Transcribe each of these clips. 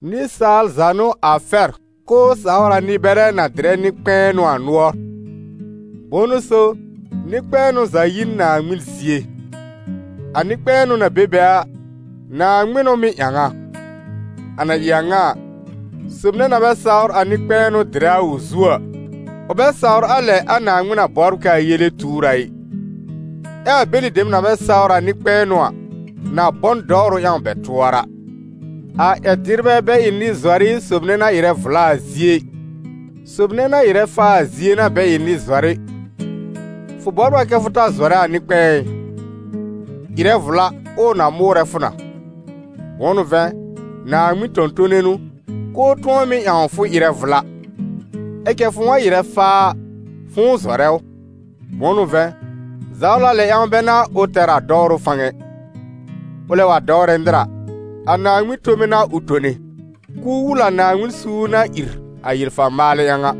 Nɩsaal za n'ʋ a fɛr k'ʋʋ sawr a nɩ-bɛrɛ na dɩrɛ nɩ-kpɛ̃nʋ a nʋɔr. Bʋ̃ʋ n'ʋ so, nɩ-kpɛ̃ɛnʋ za yi n Naaŋmɩn zie; a nɩ-kpɛ̃ɛnʋ na be be a, Naaŋmɩn n'ʋ mɩ́ ƴãw a. A na ɩ a ŋa a, sob nɛ na bɛ sawr a nɩ-kpɛ̃ɛnʋ dɩrɛ a ʋ zu a, ʋ bɛ sawr a lɛ a Naaŋmɩn na bɔbr k'aa yele tuur a ɩ. Ɛ a bɛlɩ dem na bɛ sawr a nɩ-kpɛ̃ɛnʋ a, na bɔ n dɔwrʋ ƴãw bɛ tʋɔra. A ƴɛr-dɩrbɛ bɛ ɩ nɩ-zɔrɩ sob nɛ na ɩrɛ vla a zie ɩ, sob nɛ na ɩrɛ faa a zie n'a bɛ ɩ nɩ-zɔrɩ. Fʋ bɔbr a kɛ fʋ ta zɔrɛ a nɩ-kpɛ̃ɛ ɩ? Ɩrɛ vla, ʋʋ na mʋʋrɛ fʋ na, bʋ̃ʋ n'ʋ vɛ̃, Naaŋmɩn tõ-tone n'ʋ, k'ʋʋ tʋ̃ɔ mɩ́ ƴãw fʋ ɩrɛ vla. Ɛ cɛ fʋ̃ʋ wa ɩrɛ faa a, fʋ̃ʋ zɔrɛ ʋ. Bʋ̃ʋ n'ʋ vɛ̃, zawla lɛ ƴãw bɛ n'a ʋ tɛr a dɔwrʋ fãw ɛ. Ʋlɛ wa dɔwrɛ nɩr a, a Naaŋmɩn tome n'a ʋ tone, k'ʋʋ wul a Naaŋmɩn suur na ìr a yel-fa-maalɛ ƴãw a.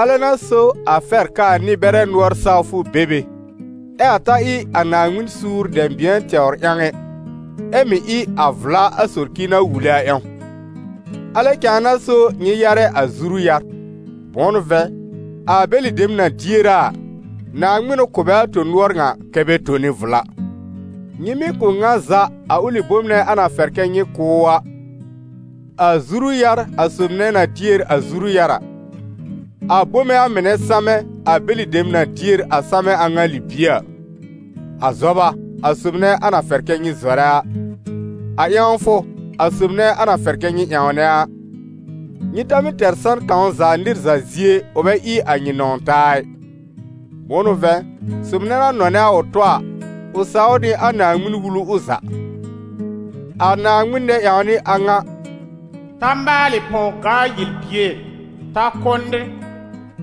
Alɛ n'a so a fɛr k'aa nɩ-bɛrɛ nʋɔr sawfʋ be be, ɛ a ta ɩ a Naaŋmɩn suur dɛ̃bɩ̃ɛ tɛwr ƴãw ɛ, ɛ mɩ̀ ɩ a vla a socir na wule a ƴãw. Alɛ cãa n'a so nyɩ yarɛ a zuru-yar; bʋ̃ʋ n'ʋ vɛ̃, a bɛlɩ dem na dier a a, Naaŋmɩn n'ʋ kʋ̀ bɛ a tõ-nʋɔr ŋa kɛ́ bɛ tone vla. Nyɩ mɩ́ kʋ̀ ŋa za a ʋlɩ bom a na fɛr kɛ nyɩ kʋ̀ ʋ a: a zuru-yar, a sob nɛ na dier a zuru-yar a; a bome a mɩnɛ samɛ, a bɛlɩ dem na dier a samɛ a ŋa libie a; a zɔba, a sob nɛ a na fɛr kɛ nyɩ zɔrɛ a; a ƴãwfʋ, a sob nɛ a na fɛr kɛ nyɩ ƴãwnɛ a. Nyɩ ta mɩ́ tɛr san kãw za nɩr za zie ʋ bɛ ɩ a nyɩ nɔ̃w-taa ɩ. Bʋ̃ʋ n'ʋ vɛ̃, sob nɛ na nɔnɛ a ʋ tɔ a, ʋ saw nɩ a Naaŋmɩn-Wulu ʋ za. A Naaŋmɩn nɛ-ƴãwnɩ a ŋa: «Ta maalɩ pɔw-gaa-yel-bier, ta kʋ́ nɩr,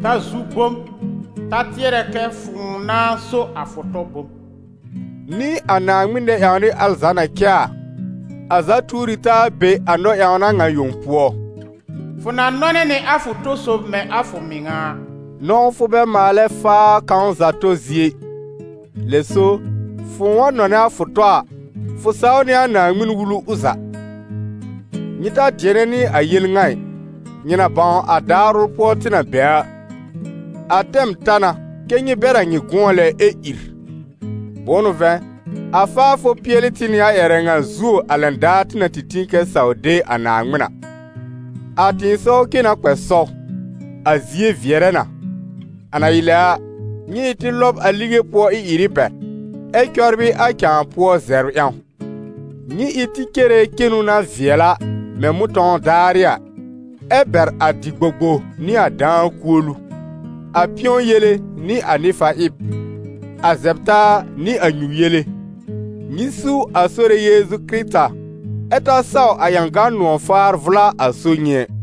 ta zu bom, ta tɩɛrɛ kɛ fʋ̃ʋ nãá so a fʋ tɔ bom», nɩ a Naaŋmɩn nɛ-ƴãwnɩ al za na cɛ a, a za tuor ɩ taa be a Naaŋmɩn nɔ-ƴãwna ŋa yõ pʋɔ: «Fʋ na nɔnɛ nɩ a fʋ to-sob mɛ̃ a fʋ mɩŋa a.» Nɔ̃wfʋ bɛ maalɛ faa kãw za tɔ zie ɩ; lɛ so fʋ̃ʋ wa nɔnɛ a fʋ tɔ a, fʋ saw nɩ a Naaŋmɩn-Wulu ʋ za. Nyɩ ta dɩɛnɩ nɩ a yel ŋa ɩ, nyɩ na bãw a daar ʋl pʋɔ tɩ na be a: a tɛm ta na kɛ́ nyɩ bɛr a nyɩ gʋ̃ɔ lɛ, ɛ ìr. Bʋ̃ʋ n'ʋ vɛ̃, a faafʋ pɩɛl tɩ nɩ a ƴɛrɛ ŋa zuo a lɛn daar tɩ na tĩ kɛ saw de a Naaŋmɩn a. A tɩ̃ɩsɔw cen na kpɛ sɔw, a zie vɩɛrɛ na. A na ɩ lɛ a, nyɩ ɩ tɩ lɔb a lige pʋɔ ɩ-ɩrɩ bɛr, ɛ cɔbrɩ a cãa pʋɔ zɛbr ƴãw. Nyɩ ɩ tɩ cere cenu na vɩɛl a, mɛ̃ mʋ̃tɔ̃w daarɩ a, ɛ bɛr a dɩ-gbogbo nɩ a dãa kuolu, a pɩ̃ɔ yele nɩ a nɩ-fa-ɩb, a zɛb-taa nɩ a nyu-yele. Nyɩ su a Sore Yeezu Kɩrɩta, ɛ ta saw a ƴãgan nʋ̃ɔ̀-faar vʋla a so nyɩ ɛ.